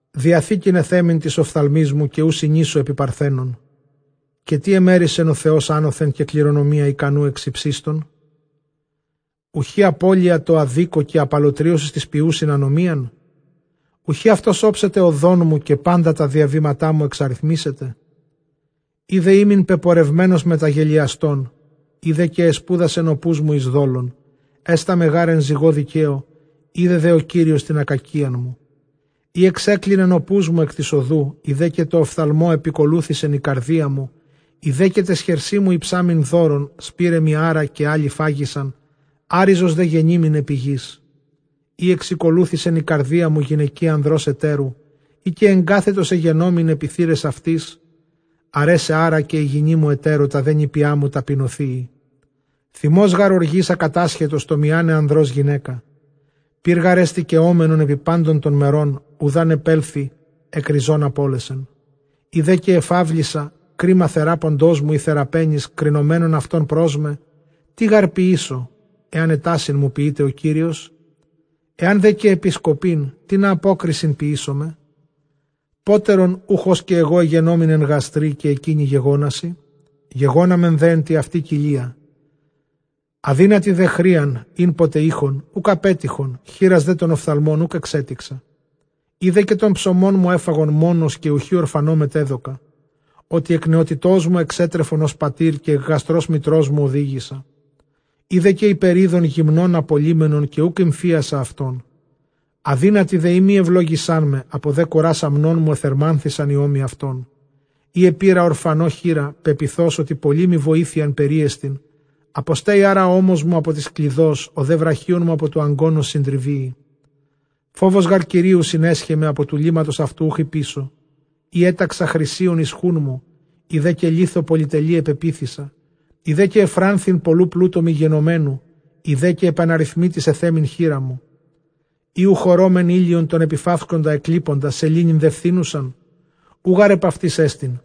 Διαθήκην ἐθέμην τοῖς ὀφθαλμοῖς μου, καὶ οὐ συνήσω ἐπὶ παρθένον. Καὶ τί ἐμέρισεν ὁ Θεὸς ἄνωθεν, καὶ κληρονομία ἱκανοῦ ἐξ ὑψίστων; Οὐαί, ἀπώλεια τῷ ἀδίκῳ, καὶ ἀπαλλοτρίωσις τοῖς ποιοῦσιν ἀνομίαν. Οὐχὶ αὐτὸς ὄψεται ὁδόν μου, καὶ πάντα τὰ διαβήματά μου ἐξαριθμήσεται; Εἰ δὲ ἤμην πεπορευμένος μετὰ γελοιαστῶν, εἰ δὲ καὶ ἐσπούδασεν ὁ πούς μου εἰς δόλον· Ἕσταμαι γὰρ ἐν ζυγῷ δικαίῳ, οἶδε δὲ ὁ Κύριος τὴν ἀκακίαν μου· Εἰ ἐξέκλινεν ὁ πούς μου ἐκ τῆς ὁδοῦ, εἰ δὲ καὶ τῷ ὀφθαλμῷ ἐπηκολούθησεν ἡ καρδία μου, εἰ δὲ καὶ ταῖς χερσί μου ἡψάμην δώρων, σπείραιμι ἄρα καὶ ἄλλοι φάγοισαν, ἄῤῥιζος δὲ γενοίμην ἐπὶ γῆς. Εἰ ἐξηκολούθησεν ἡ καρδία μου γυναικὶ ἀνδρὸς ἑτέρου, εἰ καὶ ἐγκάθετος ἐγενόμην ἐπὶ θύραις αὐτῆς, ἀρέσαι ἄρα καὶ ἡ γυνή μου ἑτέρῳ, τὰ δὲ νήπιά μου ταπεινωθείη. Θυμὸς γὰρ ὀργῆς ἀκατάσχετος, τὸ μιᾶναι ἀνδρὸς γυναῖκα. Πῦρ γάρ ἐστι καιόμενον ἐπὶ πάντων τῶν μερῶν, οὗδʼ ἂν ἐπέλθῃ ἐκ ῥιζῶν ἀπώλεσεν. Εἰ δὲ καὶ ἐφαύλισα κρίμα θεράποντός μου ἢ θεραπαίνης, κρινομένων αὐτῶν πρὸς μὲ, τί γὰρ ποιήσω ἐὰν ἔτασίν μου ποιῆται ὁ Κύριος; ἐὰν δὲ καὶ ἐπισκοπήν τινα, ἀπόκρισιν ποιήσομαι; Πότερον οὐχ ὡς καὶ ἐγὼ ἐγενόμην ἐν γαστρὶ, καὶ ἐκεῖνοι γεγόνασι; γεγόναμεν δὲ ἐν τῇ αὐτῇ κοιλίᾳ. Ἀδύνατοι δὲ χρείαν ἥν ποτε εἶχον οὐκ ἀπέτυχον, χήρας δὲ τὸν ὀφθαλμὸν οὐκ ἐξέτηξα· Εἰ δὲ καὶ τὸν ψωμόν μου ἔφαγον μόνος, καὶ οὐχὶ ὀρφανῷ μετέδωκα· Ὅτι ἐκ νεότητός μου ἐξέτρεφον ὡς πατὴρ, καὶ ἐκ γαστρὸς μητρός μου ὡδήγησα· Εἰ δὲ καὶ ὑπερεῖδον γυμνὸν ἀπολλύμενον, καὶ οὐκ ἠμφίασα αὐτόν· Ἀδύνατοι δὲ εἰ μὴ εὐλόγησάν με, ἀπὸ δὲ κουρᾶς ἀμνῶν μοῦ ἐθερμάνθησαν οἱ ὦμοι αὐτῶν· Εἰ ἐπῆρα ὀρφανῷ χεῖρα, πεποιθὼς ὅτι πολλή μοι βοήθεια περίεστιν· Ἀποσταίη ἄρα ὁ ὦμός μου ἀπὸ τῆς κλειδός, ὁ δὲ βραχίων μου ἀπὸ τοῦ ἀγκῶνος συντριβείη. Φόβος γὰρ Κυρίου συνέσχε με, ἀπὸ τοῦ λήμματος αὐτοῦ οὐχ ὑποίσω. Εἰ ἔταξα χρυσίον εἰς χοῦν μου, εἰ δὲ καὶ λίθῳ πολυτελεῖ ἐπεποίθησα, εἰ δὲ καὶ εὐφράνθην πολλοῦ πλούτου μου γενομένου, εἰ δὲ καὶ ἐπʼ ἀναριθμήτοις ἐθέμην χεῖρά μου· Ἢ οὐχ ὁρῶμεν ἥλιον τὸν ἐπιθαύσκοντα ἐκλείποντα, σελήνην δὲ φθίνουσαν; οὐ γὰρ ἐπʼ αὐτοῖς ἐστί·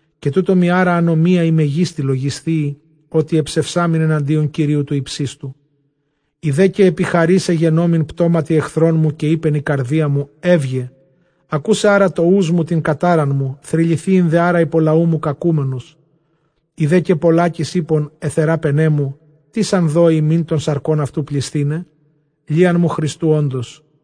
Καὶ τοῦτό μοι ἄρα ἀνομία ἡ μεγίστη λογισθείη, ὅτι ἐψευσάμην ἐναντίον Κυρίου τοῦ ὑψίστου. Εἰ δὲ καὶ ἐπιχαρὴς ἐγενόμην πτώματι ἐχθρῶν μου, καὶ εἶπεν ἡ καρδία μου, εὖγε. Ἀκούσαι ἄρα τὸ οὖς μου τὴν κατάραν μου, θρυληθείην δὲ ἄρα ὑπὸ λαοῦ μου κακούμενος. Εἰ δὲ καὶ πολλάκις εἶπον αἱ θεράπαιναί μου, τίς ἄν δῴη ἡμῖν τῶν σαρκῶν αὐτοῦ πλησθῆναι; λίαν μου χρηστοῦ ὄντος·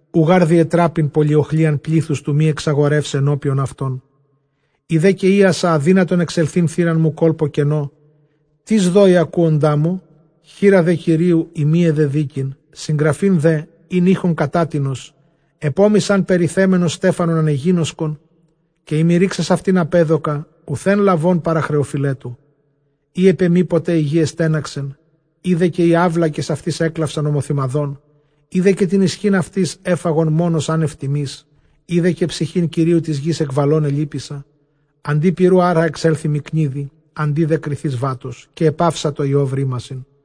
Οὐ γὰρ διετράπην πολυοχλίαν πλήθους, τοῦ μὴ ἐξαγορεῦσαι ἐνώπιον αὐτῶν· εἰ δὲ καὶ εἴασα ἀδύνατον ἐξελθεῖν θύραν μου κόλπῳ κενῷ· Τίς δῴη ἀκούοντά μου; χεῖρα δὲ Κυρίου εἰ μὴ ἐδεδοίκειν· συγγραφὴν δὲ ἣν εἶχον κατά τινος, ἐπʼ ὤμοις ἂν περιθέμενος στέφανον ἀνεγίνωσκον, καὶ εἰ μὴ ῥῆξας αὐτὴν ἀπέδωκα, οὐθὲν λαβὼν παρὰ χρεωφειλέτου· Εἰ ἐπʼ ἐμοί ποτε ἡ γῆ ἐστέναξεν, εἰ δὲ καὶ οἱ αὔλακες αὐτῆς ἔκλαυσαν ὁμοθυμαδόν· Εἰ δὲ καὶ τὴν ἰσχὺν αὐτῆς ἔφαγον μόνος ἄνευ τιμῆς, εἰ δὲ καὶ ψυχὴν κυρίου τῆς γῆς ἐκλαβὼν ἐλύπησα· Ἀντὶ πυροῦ ἄρα ἐξέλθοι μοι κνίδη, ἀντὶ δὲ κριθῆς βάτος. Καὶ ἐπαύσατο Ἰὼβ ῥήμασιν.